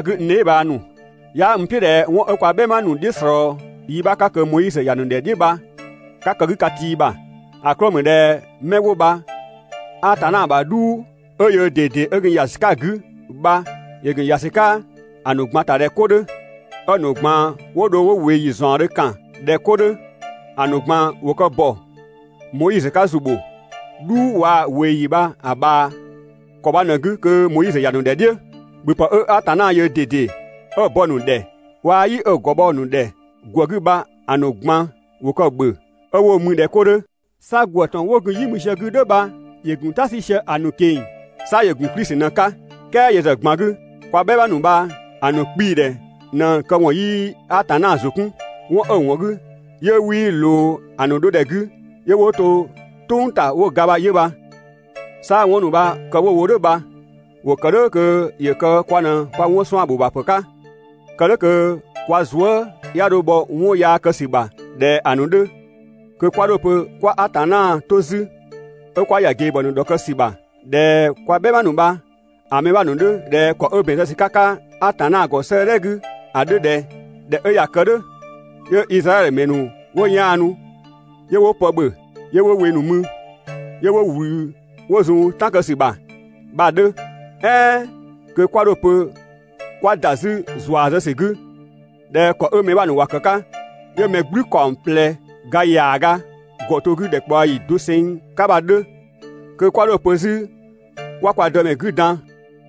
N dheebhang ‑nu, 'yaa n "piʋ̈ ꞊dhɛ 'wɔn 'ö kwa "bhɛma ‑nu "dhiʋ̈ ꞊slɔɔ yi 'bha 'ka kö Moizö ‑ya ‑nu ‑dhɛ "dhiʋ̈ bha 'ka kë‑ 'gü ka tii ‑bha. ‑A 'klɔɔ‑ ‑mü ꞊dhɛ 'mɛ 'wo bha Atanna ‑bha "dhuu 'ö yöö ꞊dede 'ö gun ‑ya ‑sü 'ka‑ 'gü bha ‑yö ‑gun ‑ya ‑sü 'ka‑ ‑nu ꞊gban ‑ta ꞊dhɛ 'ko 'dhö, 'ö‑ ‑nu ꞊gban 'wo dho 'wo ꞊weeyi ‑zaɔndhö ‑kan ꞊dhɛ 'ko 'dhö. ‑A ‑nu ꞊gban ‑wo kë ‑bɔ Moizö 'ka ‑zu ‑bho "dhuu waa‑ ꞊weeyi bha‑ ꞊bhaa ‑kɔ bha ꞊në‑ 'gü kö Moizö ‑ya ‑nu ‑dhɛ "dhiʋ̈. ‑Bhöpë 'ö Atanna yöö ꞊dede 'ö‑ bɔ‑ ‑nu ‑dhɛ waa‑ "yi 'ö‑ ‑gɔ bhɔ‑ ‑nu ‑dhɛ ‑gwë 'gü bha‑ ‑nu ꞊gban ‑wo kë‑ ‑bhö 'ö 'wo‑ mü ꞊dhɛ 'ko 'dhö. 'Sa ‑gwë ‑tɔn 'wo gun "yi mü sië‑ 'gü "dhʋ̈ bha ‑yö ‑gun "ta 'sü sië‑ ‑nu ꞊keng‑. 'Sa ‑yö ‑gun Klisi ꞊në‑ 'ka. "Kɛɛ yö ‑zë ꞊gban 'gü kwa "bhɛma ‑nu bha‑ ‑nu 'kpii‑ ‑dhɛ ꞊në‑ këwɔn 'yii Atanna ‑zʋ 'kun. 'Wɔn 'ö‑ ‑wɔn 'gü 'yö 'wii ꞊loo‑ ‑nu 'dhodhɛ 'gü 'yö 'wo to "tʋ̈ng ‑ta 'wo ga bha 'yö bha. 'Sa 'wɔn ‑nu bha kë 'wo‑ wo "dhʋ̈ bha ‑wo ‑kë "dhʋ̈ kö ‑yö kë kwa ꞊në kwa 'wɔn 'suan‑ ‑bho ‑bha ‑pë 'ka, kë "dhʋ̈ kö kwa zuë" 'ya 'dho bhɔ 'wɔn yaa kë ‑sü ‑bha ꞊dhɛ ‑a ‑nu 'dhö. Kö 'kwa 'dho‑ pö 'kwa Atanna 'to 'zü 'ö 'kwa ‑ya ꞊gebhɔ ‑nu ‑dhɔkë ‑sü ‑bha ꞊dhɛ kwa "bhɛma ‑nu bha‑ mɛ 'bha ‑nu 'dhö ꞊dhɛ ‑kɔ 'ö ‑bɛn zë ‑sü 'ka‑ 'ka Atanna ‑gɔ 'sëëdhɛ 'gü ‑a 'dhö ꞊dhɛ: «꞊Dhɛ 'ö ꞊ya kë "dhʋ̈, 'yö Izraɛdhö ‑mɛ ‑nu 'wo 'yaanu 'yö 'wo pë ‑bhö 'yö 'wo we ‑nu mü, 'yö 'wo ꞊wlü 'wo zun "tan kë ‑sü ‑bha» bha‑ 'dhö.» "Ɛɛn kö 'kwa 'dho‑ pö 'kwa ‑da 'zü ‑zua zë ‑sü 'gü 'pö ꞊dhɛ ‑kɔ 'ö‑ mɛ 'bha ‑nu ‑wa ‑kë 'ka 'yö‑ mɛ "gblü ‑kaɔng ꞊plɛ ga ‑yaaga ‑gɔ to‑ 'gü ‑dhɛkpaɔyi doseng 'ka bha‑ 'dhö. Kö 'kwa 'dho‑ pö 'zü 'kwa kwa Dëmɛ 'gü dan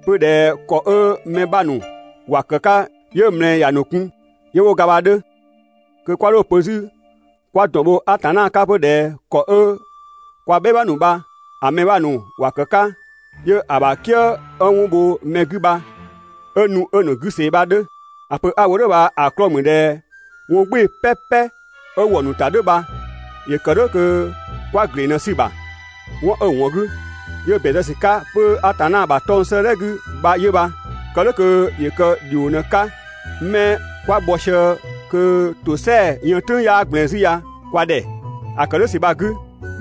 'pö ꞊dhɛ ‑kɔ 'ö‑ mɛ 'bha ‑nu ‑wa ‑kë 'ka 'yö ꞊mlɛɛ ‑ya ‑nu kun 'yö 'wo ga bha‑ 'dhö. Kö 'kwa 'dho‑ pö 'zü 'kwa ‑dɔn bho Atanna 'ka 'pö ꞊dhɛ ‑kɔ 'ö kwa "bhɛma ‑nu bha‑ mɛ 'bha ‑nu ‑wa ‑kë 'ka 'yö ‑a ‑bha "kië 'ö 'wɔn bho mɛ 'gü bha 'ö nu 'ö‑ ‑nu 'gü ꞊see bha‑ 'dhö. ‑A pö 'a‑ wo "dhʋ̈ bha‑ 'klɔɔ‑ ‑mü ꞊dhɛ 'wɔn "gbɩɩ‑ "pɛpɛ 'ö ‑wɔ ‑nu ‑ta "dhʋ̈ bha ‑yö ‑kë "dhʋ̈ kö 'kwa ‑gleng ꞊në‑ 'sü‑ ‑bha. 'Wɔn 'ö‑ ‑wɔn 'gü 'yö 'wo‑ ‑bɛn zë 'pö Atanna ‑bha 'tɔng‑ 'sëëdhɛ 'gü bha 'yö bha, kë "dhʋ̈ kö ‑yö kë ‑dhio ꞊në‑ 'ka 'mɛ 'kwa bhɔ sië kö ‑tosɛa yën "tʋ̈ng 'yaa ꞊gblɛɛn 'zü ya kwa ‑dhɛ. ‑A ‑kë "dhʋ̈ ‑sü bha‑ 'gü,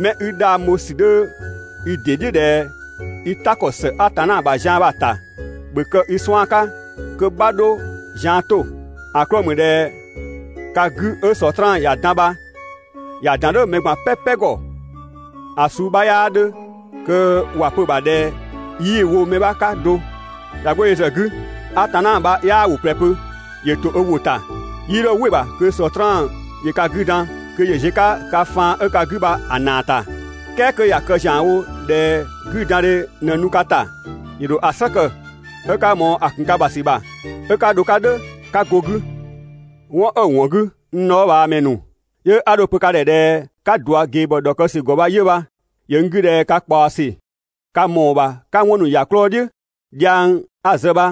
'mɛ i 'dhang bho ‑sü 'dhö i ‑dɩ "dhiʋ̈ ꞊dhɛ i "ta ‑kɔ ‑së Atanna ‑bha zian bha‑ ‑ta, ‑bhö kë i 'suan‑ 'ka kö 'bha 'dho zian 'to. ‑A 'klɔɔ‑ ‑mü ꞊dhɛ ka 'gü 'ö Sɔtraan ‑ya dan bha ‑ya ‑dan "dhʋ̈ mɛ ꞊gban "pɛpɛ ‑gɔ, ‑a suu 'bha 'yaa 'dhö kö ‑wa pö‑ ‑bha ꞊dhɛ 'yii wo mɛ 'bha 'ka do. ꞊Ya 'go yö ‑zë 'gü, Atanna bha 'yaa ‑wʋ ꞊plɛ pö, ‑yö ‑to ö ‑wʋ ‑ta. 'Yii 'dho "wɩ‑ ‑bha kö Sɔtraan ‑yö ka 'gü dan kö ‑yö ziö‑ 'ka ka faan 'ö ka 'gü bha‑ ‑naa ‑ta. "Kɛɛ 'kö ꞊ya kë ‑zianwo ꞊dhɛ 'güdandhe ꞊në nu ka ‑ta, ‑yö ‑dho ‑a "slë kë 'ö 'ka ꞊mɔɔ‑ ‑kun ka ‑bha ‑sü ‑bha, 'ö 'ka dho‑ 'ka "dhʋ̈ 'ka go‑ 'gü. 'Wɔn 'ö‑ ‑wɔn 'gü, n dhɔɔbhaamɛ ‑nu, 'yö 'a dho‑ pö ka ‑dhɛ ꞊dhɛ 'ka ꞊dua ꞊gebhɔ ‑dhɔkë ‑sü ‑gɔ bha 'yö bha. ‑Yö n 'gü ꞊dhɛ ka ꞊kpaɔ ‑sü, ka ‑mɔɔ ‑bha 'ka 'wɔn ‑nu ‑ya 'klɔɔ‑ "dhiʋ̈, dhiang 'a‑ zë bha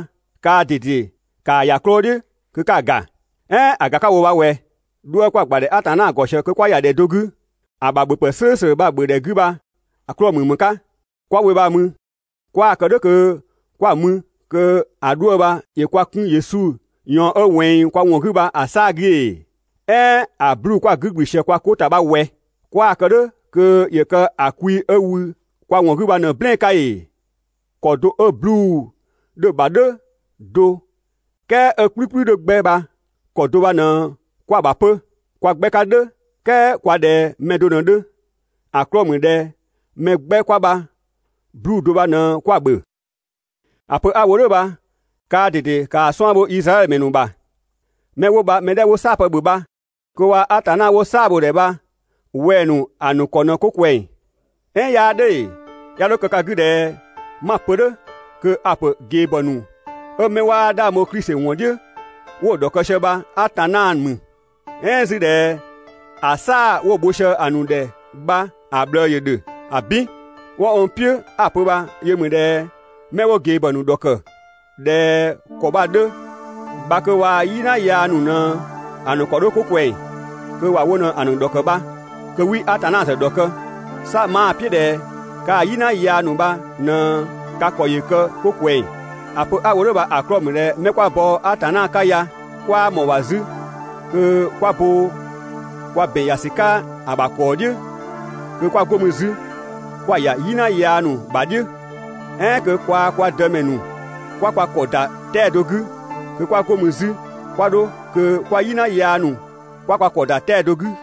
kaa ꞊dede ‑kaa ‑ya 'klɔɔ‑ "dhiʋ̈ kö 'ka‑ ‑ga. "Ɛɛn ‑a ‑ga 'ka‑ wo bha ꞊wɛ, 'dhuë‑ 'kwa‑ ‑gbadhɛ Atanna ‑gɔ ꞊sië kö 'kwa ‑ya ‑dhɛ do 'gü ‑a ‑bha ‑bhöpë "slʋ̈ʋ̈slʋ̈ bha‑ ‑bhö ‑dhɛ 'gü bha‑ 'klɔɔ‑ ‑mü ‑më 'ka? 'Kwa‑ we bha‑ mü 'kwaa‑ kë "dhʋ̈ kö 'kwa‑ mü kö ‑a 'dhuë‑ bha ‑yö kwa 'kun Yesu ꞊yɔɔn 'ö ꞊wɛnng kwa ‑wɔn 'gü bha‑ 'saa‑ 'gü ‑ee? "Ɛɛn ‑a 'bluu‑ 'kwa‑ 'gü ‑gblü sië kwa 'ko ‑ta bha ꞊wɛ? 'Kwaa‑ kë "dhʋ̈ kö ‑yö kë ‑a kwi 'ö wü kwa ‑wɔn 'gü bha ꞊në‑ "blɛɛn‑ 'ka ‑ee? ‑Kɔ do 'ö 'bluu‑ 'dhö‑ ‑bha "dhʋ̈ do "kɛɛ 'ö‑ "kplükplü 'dhö 'gbɛ bha, ‑kɔ do bha ꞊në 'kwa‑ ‑bha 'pö. Kwa 'gbɛ 'ka "dhʋ̈ "kɛɛ kwa ꞊dhɛ mɛ do ꞊në‑ 'dhö. ‑A 'klɔɔ‑ ‑mü ꞊dhɛ mɛ 'gbɛ 'kwa bha 'bluu‑ do bha ꞊në 'kwa‑ ‑bhö. ‑A pö 'a‑ wo "dhʋ̈ bha kaa ꞊dede ‑kaa 'suan‑ bho Izraɛdhö ‑mɛ ‑nu ‑bha. 'Mɛ 'wo bha‑ mɛ 'dhɛ 'wo "saa‑ pë ‑bhö bha kö waa‑ Atanna 'wo‑ "saa‑ bho‑ ‑dhɛ bha wɛng‑ ‑nu ‑a ‑nu ‑kɔ ꞊në 'ko ꞊kwɛng. "Ɛɛn 'yaa "dhʋ̈ ‑ee? 'Ya 'dho kë ka 'gü ꞊dhɛ 'ma‑ pö "dhʋ̈ kö a‑ ‑pö ꞊gebhɔ ‑nu 'ö 'mɛ 'waa 'dhang bho Klisi ‑wɔn "dhiʋ̈ 'wo‑ ‑dhɔkë sië bha Atanna ‑mü, "ɛɛn 'zü ꞊dhɛ ‑a "saa‑ 'wo‑ bho sië‑ ‑nu ‑dhɛ bha‑ ꞊bhlëë ‑yö ‑dhö. ‑Abin! 'Wɔn n "piʋ̈ 'a‑ pö bha yö ‑mü ꞊dhɛ 'mɛ 'wo ꞊gebhɔ ‑nu ‑dhɔkë ꞊dhɛ ‑kɔ bha‑ 'dhö bha kö waa‑ "yina yaa ‑nu ꞊në‑ ‑nu ‑kɔ 'dhö 'ko ꞊kwɛng, kö ‑wa wo ꞊në‑ ‑nu ‑dhɔkë bha, kö 'wii Atanna ‑zë ‑dhɔkë, 'sa 'maa‑ "piʋ̈ ꞊dhɛ kaa "yina yaa ‑nu bha ꞊në ka ‑kɔ ‑yö kë 'ko ꞊kwɛng. ‑A pö 'a‑ wo "dhʋ̈ bha‑ 'klɔɔ‑ ‑mü ꞊dhɛ 'mɛ 'kwa bɔ Atanna 'ka ya 'kwaa ꞊mɔɔ‑ ‑bha 'zü kö 'kwa bo kwa ‑bɛn ‑ya ‑sü 'ka‑ ‑bha ‑kɔɔ "dhiʋ̈, kö 'kwa 'go mü 'zü 'kwa‑ ‑ya "yina yaa ‑nu ‑bha "dhiʋ̈. "Ɛɛn kö kwaa‑ kwa Dëmɛ ‑nu 'kwa kwa ‑kɔ ‑da 'tɛa‑ do 'gü kö 'kwa 'go mü 'zü 'kwa 'dho kö kwaa‑ "yina yaa ‑nu 'kwa kwa ‑kɔ ‑da 'tɛa‑ do 'gü.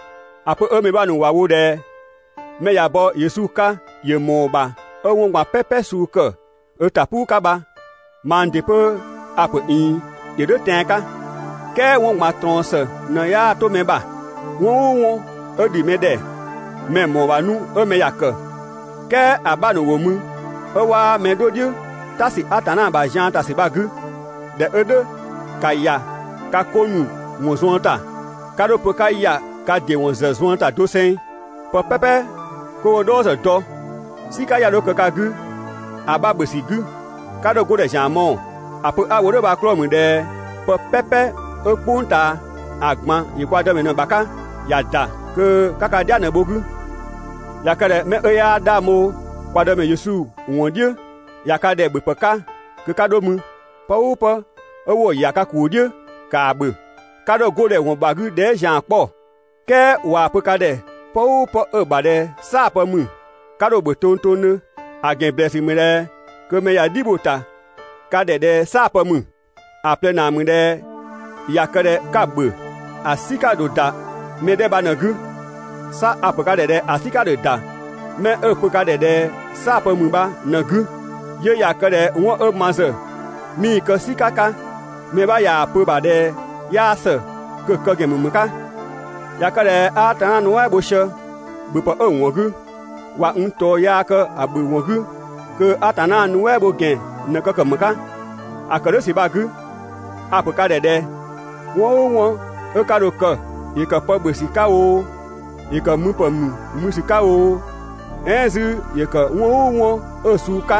‑A pö 'ö mɛ 'bha ‑nu ‑wa wo ꞊dhɛ 'mɛ ꞊ya bɔ Yesu 'ka ‑yö ‑mɔɔ ‑bha 'ö 'wɔn ꞊gban "pɛpɛ suu ‑kë ö ‑ta "puu 'ka bha, mang ‑dɩ 'pö a‑ ‑pö ꞊iin ‑yö "dhʋ̈ tɛan‑ 'ka, "kɛɛ 'wɔn ꞊gban ꞊trɔɔn ‑së ꞊në 'yaa 'to mɛ ‑bha. 'Wɔn "ʋʋ 'wɔn 'ö ‑dhi mɛ ‑dhɛ mɛ‑ ‑mɔɔ ‑bha 'nu 'ö mɛ ‑ya ‑kë, "kɛɛ ‑a 'bha ‑nu ‑wo mü 'ö 'waa mɛ 'dho "dhiʋ̈ "ta ‑sü Atanna ‑bha zian ‑ta ‑sü bha‑ 'gü. ꞊Dhɛ 'ö "dhʋ̈, ‑ka ‑ya ka 'ko ‑nu ‑wɔn zuën ‑ta. 'Ka 'dho‑ pö 'ka ‑ya ka ‑dɩ ‑wɔn ‑zë zuën ‑ta doseng. Pë "pɛpɛ 'kö 'wo‑ "dhɔɔ ‑zë dɔ, "sika 'ya 'dho kë ka 'gü ‑a 'bha ‑bhö ‑sü 'gü. 'Ka 'dho‑ 'godhɛ ‑zian mɔɔ‑. ‑A pö 'a‑ wo "dhʋ̈ bha‑ 'klɔɔ‑ ‑mü ꞊dhɛ pë "pɛpɛ 'ö "kpʋng ꞊taa, ‑a ꞊gban ‑yö kwa Dëmɛ ꞊në‑ ‑bha 'ka, (‑ya ‑da kö 'ka ka "dhia ꞊në‑ bho‑ 'gü). ꞊Ya kë ꞊dhɛ 'mɛ 'ö 'yaa 'dhang bho kwa Dëmɛ Yesu ‑wɔn "dhiʋ̈ ꞊ya ka ‑dhɛ ‑bhöpë 'ka kö 'ka 'dho mü, pë "ʋʋ pë 'wo‑ ‑ya ka ‑kuu "dhiʋ̈ ‑kaa ‑bhö, 'ka 'dho‑ 'go ‑dhɛ ‑wɔn ‑bha 'gü dhɛɛ" ‑zian 'kpɔ. "Kɛɛ ꞊waa‑ pö ka ‑dhɛ pë "ʋʋ pë 'ö‑ ‑bha ꞊dhɛ "saa‑ pë ‑mü, 'ka 'dho‑ ‑bhö tongtongdhö, ‑a ‑gɛn ‑blɛɛsü ‑mü ꞊dhɛ kö mɛ ꞊ya "dhi bho‑ ‑ta ka ‑dhɛ ꞊dhɛ "saa‑ pë ‑mü. ‑A ꞊plɛ ‑naa ‑mü ꞊dhɛ ꞊ya kë ꞊dhɛ 'ka‑ ‑bhö, ‑a "sika ‑dho ‑da mɛ 'dhɛ bha ꞊në‑ 'gü. 'Sa a‑ ‑pö ka ‑dhɛ ꞊dhɛ ‑a "sika ‑dho ‑da 'mɛ 'ö‑ pö ka ‑dhɛ ꞊dhɛ "saa‑ pë ‑mü bha ꞊në‑ 'gü. 'Yö ꞊ya kë ꞊dhɛ 'wɔn 'ö ma ‑zë 'mii‑ kë "sika 'ka, mɛ 'bha ꞊yaa‑ pö‑ ‑bha ꞊dhɛ 'yaa ‑së, kö‑ kë ‑gɛn ‑mü ‑më 'ka? ꞊Ya kë ꞊dhɛ 'a Atanna nuɛ" bho sië ‑bhöpë 'ö‑ ‑wɔn 'gü, ꞊wa n ꞊tɔɔ yaa kë‑ ‑bhö ‑wɔn 'gü kö Atanna nuɛ" bho ‑gɛn ꞊në kë ‑kë ‑më 'ka? ‑A ‑kë "dhʋ̈ ‑sü bha‑ 'gü, a‑ ‑pö ka ‑dhɛ ꞊dhɛ: 'Wɔn "ʋʋ 'wɔn 'ö ka dho‑ kë, ‑yö ‑kë pë ‑bhö ‑sü 'ka oo, ‑yö ‑kë müpë ‑nu mü ‑sü 'ka oo, "ɛɛn 'zü ‑yö ‑kë 'wɔn "ʋʋ 'wɔn 'ö‑ suu 'ka,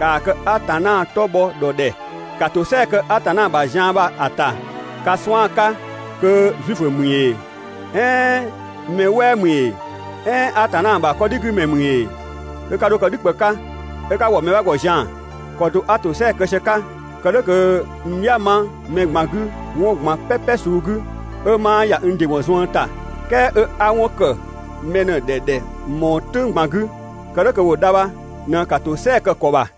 ‑kaa kë Atanna 'tɔ bhɔ ‑dhɔ ‑dhɛ. ‑Ka ‑tosɛa kë Atanna ‑bha zian bha‑ ‑ta ka 'suan‑ 'ka kö Zuifö ‑mü ‑ee, "ɛɛn mɛ "wɛɛ ‑mü ‑ee, "ɛɛn Atanna ‑bha 'kɔdhigümɛ ‑mü ‑ee, kö 'ka 'dho kë "dhü ꞊kpë 'ka 'ö 'ka ‑wɔ mɛ 'bha ‑gɔ zian‑. ‑Kɔ do 'a ‑tosɛa kë sië‑ 'ka kë "dhʋ̈ kö n "dhia‑ 'ma mɛ ꞊gban 'gü 'wɔn ꞊gban "pɛpɛ suu 'gü, 'ö 'maa ‑ya n ‑dɩ ‑wɔn zuën ‑ta, "kɛɛ 'ö 'a 'wɔn ‑kë mɛ ꞊në‑ ‑dhɛ ‑dhɛ ꞊mɔɔ "tʋng ꞊gban 'gü, kë "dhʋ̈ kö ‑wo dha bha ꞊në ‑ka ‑tosɛa kë‑ ‑kɔ ‑bha.